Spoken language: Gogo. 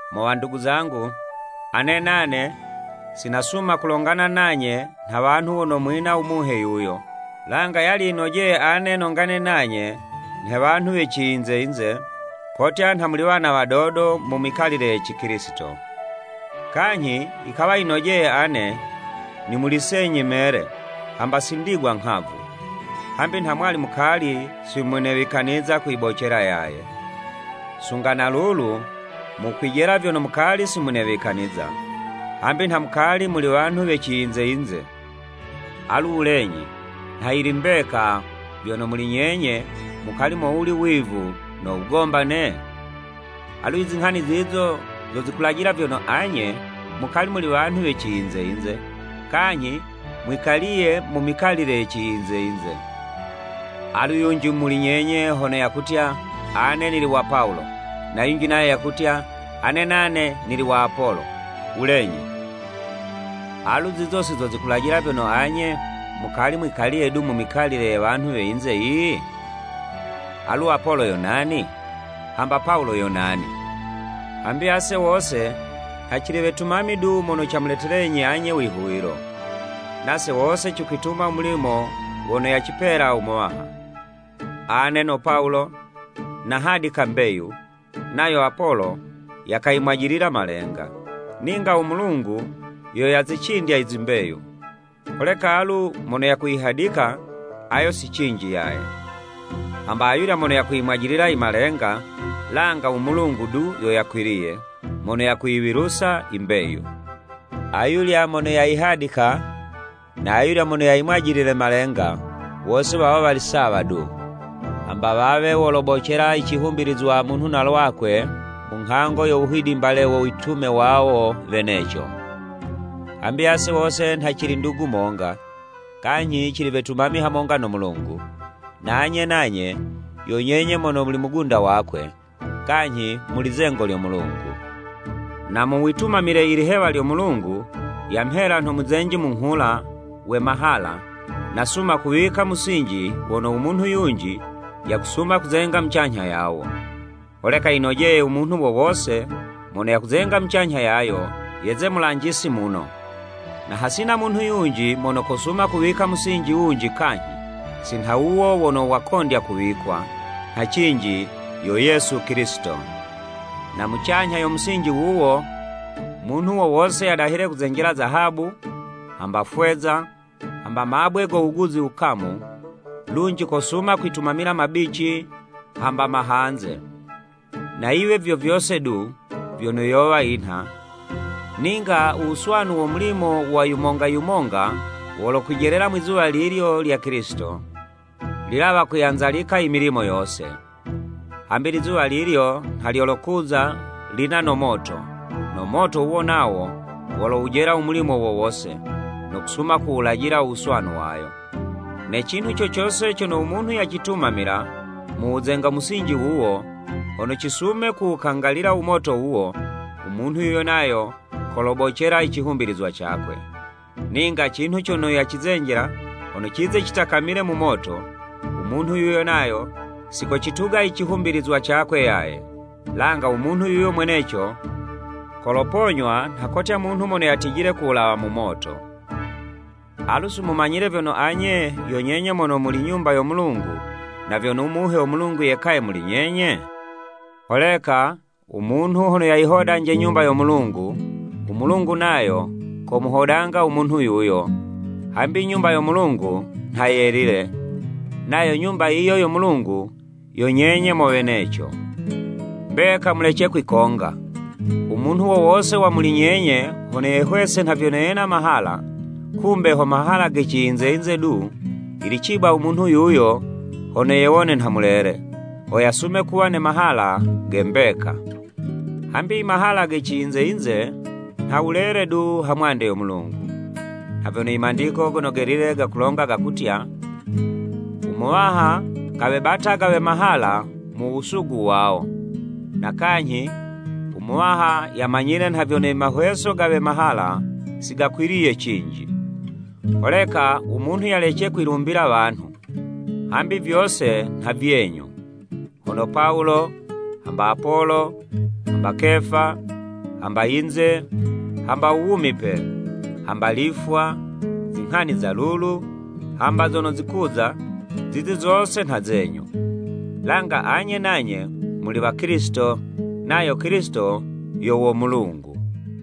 Mo wandugu zangu, ane nane, si nasuma kulongana nanye nha wanhu wono mwina u Muhe yuyo. Langa yali yinojeye ane nongane nanye, nhe wanhu we ciyinze-yinze, kotya nha muli wana wadodo mu mikalile ye Cikilisito. Kanyhi yikawa yinojeye ane, nimulisenyi mele, hamba si ndigwa inghavu, hambi nha mwali mukali si munewikaniza kuyibocela yaye. Sunga na lulu mukwijela vyono mukali si munewikaniza, hambi nha mukali muli wanhu we ciyinze-yinze. Alu wulenyi, nha yili mbeka, vyono muli nyenye mukali mowuli wivu no wugombane? Alu i zinghani zizo zo zikulajilila vyono anye, mukali muli wanhu we ciyinze yinze, kanyhi mwikaliye mu mikalile ye ciyinze yinze. Alu yunji muli nyenye hono yakutya, “Ane nili wa Pawulo,” na yunji nayo yakutya, “Ane nane nili wa Apolo,” wulenyi, alu zizo si zo zikulajila vyono anye mukali mwikaliye du mu mikalile ye wanhu we yinze yiyi? Alu, Apolo yo nani? Hamba Pawulo yo nani? Hambi ase wose nha cili wetumami du, mono camuletelenyi anye u wihuwilo. Nase wose cikwituma u mulimo wono yacipela u Muwaha. Ane no Pawulo, nahadika mbeyu, nayo Apolo, yakayimwajilila malenga, ninga u Mulungu yo yazicindya i zimbeyu. Holeka alu mono yakuhadika, ayo si cinji yaye, hamba ayulya mono yakumwajilila i malenga, langa u Mulungu du yo yakwiliye, mono yakuyiwilusa i mbeyu. Ayulya mono yayihadika, na ayulya mono yayimwajilile malenga, wose wawo wali sawa du, hamba wawe wolobocela i cihumbilizwa munhu na lwakwe mu nghango yo wuhidimbale wo witume wawo weneco. Hambi ase wose nha cili ndugu monga, kanyhi cili wetumami hamonga no Mulungu, na anye nanye, yo nyenye mono muli mugunda wakwe, kanyhi muli zengo lyo Mulungu. Na mu witumamile i lihewa lyono u Mulungu yamhela, nho muzenji munghula, we mahala, nasuma kuwika musinji wono u munhu yunji, yakusuma kuzenga mucanyha yawo. Holeka yinojeye u munhu wo wose mono yakuzenga mucanyha yayo, yeze mulanjisi muno. Na hasina munhu yunji mono kosuma kuwika musinji wunji kanyhi, si nha wuwo wono wakondya kuwikwa, nha cinji yo Yesu Kilisito. Na mucanyha yo musinji wuwo, munhu wo wose yadahile kuzenjela zahabu, hamba fweza, hamba mabwe go wuguzi wukamu, lunji kosuma kwitumamila mabici hamba mahanze. Na yiwe vyo vyose du, vyono yowa yinha, ninga u wuswanu wo mulimo wa yumonga yumonga, wolokwijelela Mwizuwa lilyo lya Kilisito, lilawa kuyanzalika i milimo yose. Hambi Lizuwa lilyo nha lyolokuza lina no moto, no moto wuwo nawo, wolowujela u mulimo wo wose, no kusuma kuwulajila u wuswanu wayo. Ne cinhu co cose cono u munhu yacitumamila, mu wuzenga mu musinji wuwo, hono cisume kuwukangalila u moto wuwo, u munhu yuyo nayo kolobocela i cihumbilizwa cakwe, ninga cinhu cono yacizenjela, hono cize citakamile mu moto, u munhu yuyo nayo si kocituga i cihumbilizwa cakwe yaye, langa u munhu yuyo mweneco, koloponywa nha kotya munhu mono yatijile ku wulawa mu moto. Alu, si mumanyile vyono anye, yo nyenye mono muli Nyumba yo Mulungu, na vyono u Muhe wo Mulungu yekaye muli nyenye. Holeka u munhu hono yayihodanje Nyumba yo Mulungu, u Mulungu nayo komuhodanga u munhu yuyo, hambi Nyumba yo Mulungu nha yelile, nayo Nyumba yiyo yo Mulungu, yo nyenye mo weneco. Mbeka mulece kwikonga! U munhu wo wose wa muli nyenye hono yehwese nha vyono yena mahala, kumbe ho mahala ge ciyinze-yinze du, yili ciba u munhu yuyo hono yewone nha mulele, ho yasume kuwa ne mahala ge mbeka. Hambi i mahala ge ciyinze-yinze, nha wulele du ha mwande yo Mulungu. Nha vyono i Mandiko Gono Gelile gakulonga gakutya, “U Muwaha kawebataga we mahala, mu wusugu wawo.” Na kanyhi, “U Muwaha yamanyile nha vyono i mahweso ga we mahala, si gakwiliye cinji.” Holeka u munhu yalece kwilumbila wanhu. Hambi vyose nha vyenyu. Hono Pawulo, hamba Apolo, hamba Kefa, hamba yinze, hamba u wumipe, hamba lifwa, zinghani za lulu, hamba zono zikuza, zizi zose nha zenyu. Langa anye nanye muli wa Kilisito, nayo Kilisito yo wo Mulungu.